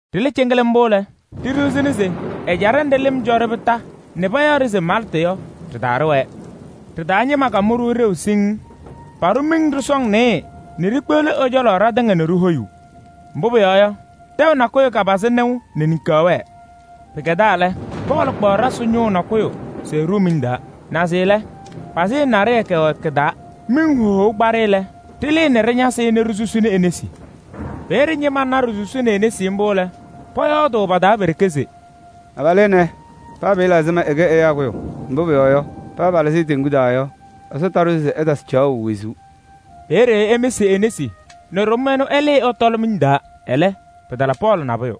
Ɖɩlɩ cɩŋɩlɩm mbʋ lɛ, ɖiɖiɣzini se ɛjaɖɛ nɖɩ lɩm cɔ-ɖɩ kondiko nɛ payaɣ-ɖɩ se Maltɩ yɔ, ɖɩ-taa ɖɩwɛɛ. Ɖɩ-taa ñɩma kamʋ-ɖʋ ɖeu siŋŋ: paɖʋ miŋ sɔsɔŋ nɩɩyɩ nɛ ɖikpeɣli ɛ-cɔlɔ ɖatɩŋa nɛ ɖihoyuu. Mbʋ pʋyɔɔ yɔ, tɛʋ nakʋyʋ kapazɩ nɩʋ nɛ niŋkaɣ wɛɛ. Pɩkɛdaa lɛ, Pɔɔlɩ kpaɣ ɖasɩ ñʋʋ nakʋyʋ se ɛɖʋʋ miŋ taa, naze lɛ, pazɩyɛ naɖɩyɛ kɛwɛ kɩ-taa. Miŋ hohou kpa-ɖɩ lɛ, ɖɩlɩɩ nɛ ɖɩñasɩ-ɩ nɛ ɖisusini e-nesi. Peeye ñɩma na ɖisusini e-nesi mbʋ lɛ, pɔyɔɔdʋʋ pa-taa pe-ɖeke se: “Abalʋ ɛnɛ, paa pɩɩla ɛzɩma ɛkɛ ɛyaa kʋyʋ, mbʋ pʋyɔɔ yɔ, paa pɩlɩzɩ-ɩ teŋgu taa yɔ, Ɛsɔ taɖʋ se ɛtasɩ caɣʋ wezuu.” Peeye ɛmɩsɩ e-nesi nɛ ɖʋm ɛnʋ ɛlɩɩ ɛtɔlɩ miŋ taa. Ɛlɛ, pɩtala Pɔɔlɩ nabʋyʋ.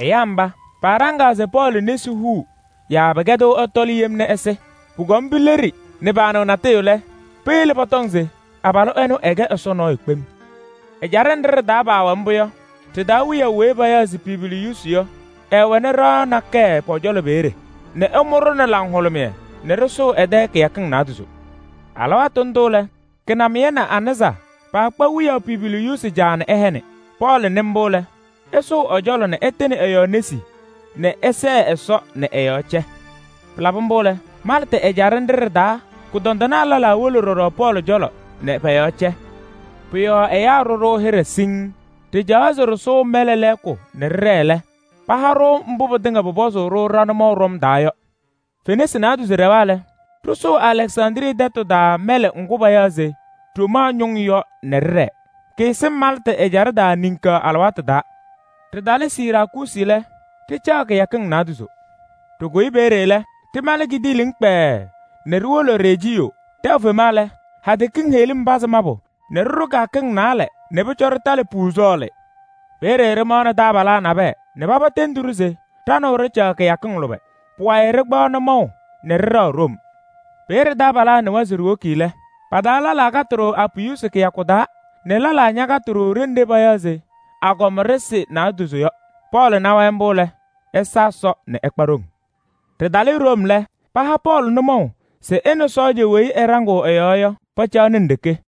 Ɛyaa mba, paaɖaŋaa se Pɔɔlɩ nesi huu yaa pɩkɛdɩɣ ɛtɔlɩ yem nɛ ɛsɩ. Pʋkɔm pileɖi nɛ paanɩɣ natʋyʋ lɛ, peyele pɔtɔŋ se abalʋ ɛnʋ ɛkɛ ɛsɔ nɔɔyʋ kpem. Ɛjaɖɛ nɖɩ ɖɩ-taa paawɛ mbʋ yɔ, ɖɩ-taa wiyaʋ weyi payaɣ se Publiyuusi yɔ, ɛɛwɛnɩ ɖɩɣa nakɛyɛ pʋ-cɔlɔ peeye nɛ ɛmʋ-ɖʋ nɛ laŋhʋlʋmɩyɛ nɛ ɖɩsʋʋ ɛ-tɛ kɩyakɩŋ naadozo. Alɩwaatʋ ndʋ lɛ, kɩnamɩyɛ nɛ anɩza paakpa wiyaʋ Publiyuusi caa nɛ ɛhɛnɩ. Pɔɔlɩ nɩ mbʋ lɛ, ɛsʋʋ ɛ-cɔlɔ nɛ ɛtɩnɩ ɛ-yɔɔ nesi nɛ ɛsɛɛ Ɛsɔ nɛ ɛ-yɔɔ cɛ. Pɩlabɩ mbʋ lɛ, Maltɩ ɛjaɖɛ nɖɩ ɖɩ-taa kʋdɔndɩnaa lɛlaa wolo ɖɔɖɔ Pɔɔlɩ cɔlɔ nɛ pɔ-yɔɔ cɛ. Pʋ-yɔɔ ɛyaa ɖʋ-ɖʋ hɩɖɛ siŋŋ, ɖɩcaɣaɣ se ɖɩsʋʋ mɛlɛ lɛɛkʋ nɛ ɖɩɖɛɛ lɛ, paha-ɖʋ mbʋ pɩtɩŋa pʋpɔzʋʋ-ɖʋ ɖa-nʋmɔʋ ɖɔm taa yɔ. Fenasɩ naadozo ɖɛwa lɛ, ɖɩsʋʋ Alɛksandrii tɛtʋ taa mɛlɛ ŋgʋ payaɣ se Ɖomaa Ñʋŋ yɔ nɛ ɖɩɖɛɛ. Kɩɩsɩŋ Maltɩ ɛjaɖɛ taa niŋkaɣ alɩwaatʋ taa. Ɖɩtalɩ Siraakuusi lɛ, ɖɩcaɣ kɩyakɩŋ naadozo. Ɖɩkʋyɩ peeye lɛ, ɖɩmalɩ kidiiliŋ kpɛɛɛ nɛ ɖiwolo Rejiyoo. Tɛʋ fema lɛ, hadɛ kiŋ heɣlim pazɩ mabʋ nɛ ɖɩɖʋ kɩyakɩŋ naalɛ nɛ pʋcɔ ɖɩtalɩ Puuzɔɔlɩ. Peeye ɖɩmaɣnɩ taabalaa nabɛyɛ nɛ paba tendi-ɖʋ se ɖa nɛ wɛ ɖɩcaɣ kɩyakɩŋ lʋbɛ. Pʋwayɩ ɖɩkpaɣ nʋmɔʋ nɛ ɖɩɖɛɣ Room. Peeye taabalaa nɩwa se ɖiwoki lɛ, pa-taa lɛlaa katɩ-ɖʋ Apiyuusi kɩyakʋ taa nɛ lɛlaa ñakatɩ-ɖʋ ɖenɖe payaɣ se Agɔma Ɖɩsɩ Naadozo yɔ. Pɔɔlɩ na-wɛ mbʋ lɛ, ɛsa Ɛsɔ nɛ ɛkpa ɖoŋ. Ɖɩtalɩ Room lɛ, paha Pɔɔlɩ nʋmɔʋ se ɛ nɛ sɔɔja weyi ɛɖaŋɩɣ ɛ-yɔɔ yɔ, pacaɣnɩ nɖeke.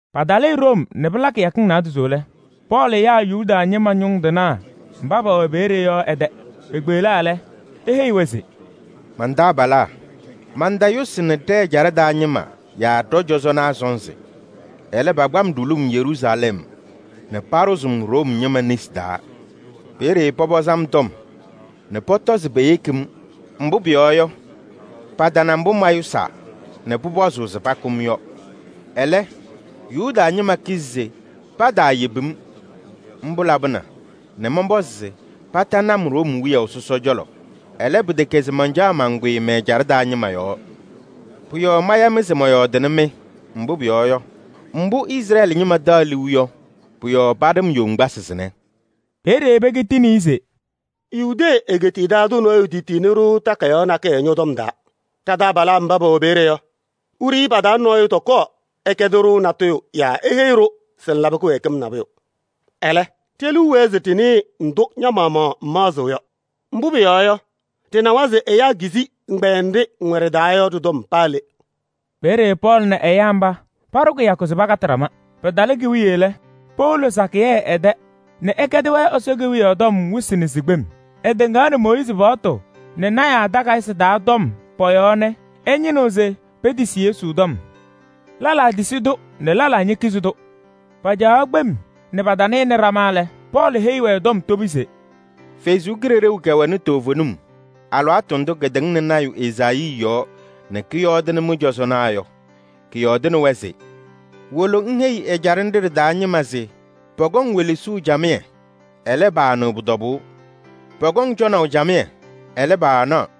Patalɩ Room nɛ pɩla kɩyakɩŋ naadozo lɛ, Pɔɔlɩ yaa Yuda ñɩma ñʋŋ tɩnaa mba pɛwɛ peeye yɔ ɛ-tɛ. Pekpeɣlaa lɛ, eheyi-wɛ se: “Man-taabalaa! Mantayʋsɩnɩ ɖɛ-ɛjaɖɛ taa ñɩma yaa ɖɔ-cɔzɔnaa sɔnzɩ. Ɛlɛ, pakpa-m ɖulum Yeruusalɛm nɛ paɖʋzɩ-m Room ñɩma nesi taa. Peeye pɔpɔzɩ-m tɔm nɛ pɔtɔ se peyeki-m, mbʋ pʋyɔɔ yɔ, patana mbʋ mayʋsaa nɛ pʋpɔzʋʋ se pakʋ-m yɔ. Ɛlɛ, Yuda ñɩma kizi se pataayebi-m. Mbʋ labɩna nɛ mɔnpɔzɩ se patanɩ-m Room wiyaʋ sɔsɔ cɔlɔ. Ɛlɛ pɩtɛkɛ se mancaɣ mankʋyɩ mɛ-ɛjaɖɛ taa ñɩma yɔɔ. Pʋ-yɔɔ maya-mɩ se mɔyɔɔdɩnɩ-mɩ, mbʋ pʋyɔɔ yɔ, mbʋ Izrɛɛlɩ ñɩma taɣ liu yɔ, pʋ-yɔɔ paɖɩ-m yoŋgbasɩ sɩnɛ.” Peeye pekitini-i se: “Yudee egeetiye taa tʋ nɔɔyʋ tetiyini-ɖʋ takayaɣ nakɛyɛ ñɔ-tɔm taa. Ɖa-taabalaa mba pɛwɛ peeye yɔ, wiɖiyi pa-taa nɔɔyʋ tɔkɔɔ ɛkɛdɩ-ɖʋ natʋyʋ yaa eheyi-ɖʋ se ŋlabɩ kɩwɛɛkɩm nabʋyʋ. Ɛlɛ, ɖe-liu wɛɛ se ɖɩnɩɩ ndʋ ña-maɣmaɣ ŋmaɣzɩɣ yɔ. Mbʋ pʋyɔɔ yɔ, ɖɩnawa se ɛyaa kizi ɛgbɛyɛ nɖɩ ŋwɛ ɖɩ-taa yɔ ɖɩ-tɔm paa le.” Peeye Pɔɔlɩ nɛ ɛyaa mba paɖʋ kɩyakʋ se pakatɩ ɖama. Pɩtalɩ ki-wiye lɛ, powolo sakɩyɛ ɛ-tɛ nɛ ɛkɛdɩ-wɛ Ɛsɔ Kewiyaɣ tɔm wɩsɩ nɛ sikpem: ɛtɩŋaɣnɩ Mooyiizi paɣtʋ nɛ lɔɔyɩsɩ tɩnaa takayɩsɩ taa tɔm pɔ-yɔɔ nɛ ɛñɩnɩɣ se petisi Yesu tɔm. Lɛlaa tisi-tʋ nɛ lɛlaa ñekizi-tʋ. Pacaɣaɣ kpem nɛ patanɩnɩ ɖama lɛ, Pɔɔlɩ heyi-wɛ tɔm tobi se: “Ɛsɔ Kalɩzaɣ kɛwɛnɩ toovenim alɩwaatʋ ndʋ katɩŋnɩ lɔɔyaɣ tʋ Ezaayii yɔɔ nɛ kɔyɔɔdɩnɩ mɩ-cɔzɔnaa yɔ! Kɔyɔɔdɩnɩ-wɛ se: ‘Wolo ŋheyi ɛjaɖɛ nɖɩ ɖɩ-taa ñɩma se pɔkɔŋ welesuu camɩyɛ, ɛlɛ, paanɩɣ pʋ-tɔbʋʋ. Pɔkɔŋ cɔnaʋ camɩyɛ, ɛlɛ, paanaɣ.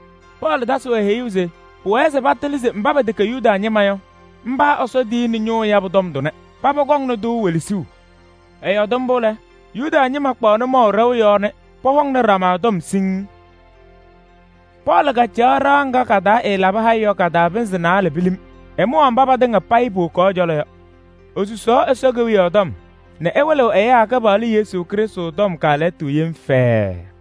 Pɔɔlɩ tasɩ-wɛ heyuu se pʋwɛɛ se patɩlɩ se mba pɛtɛkɛ Yuda ñɩma yɔ, mba Ɛsɔ tiyini ñʋʋ yabʋ tɔm tʋnɛ. Paba kɔŋnɩ-tʋ welesuu! [ Ɛyɔɔdɩ mbʋ lɛ, Yuda ñɩma kpaɣ nʋmɔʋ ɖɛʋ yɔɔ nɛ pɔhɔŋnɩ ɖama tɔm siŋŋ.] Pɔɔlɩ kacaɣ ɖɩɣa ŋga ɛɛlabɩ haya yɔ ka-taa pɩnzɩ naalɛ pilim. Ɛmʋwaɣ mba patɩŋa payɩ powokaɣ ɛ-cɔlɔ yɔ. Esusaɣ Ɛsɔ Kewiyaɣ tɔm nɛ ɛwɩlɩɣ ɛyaa Kɩpaɣlʋ Yesu Krɩstʋ tɔm kaalɛyɩtʋ yem fɛɛɛ.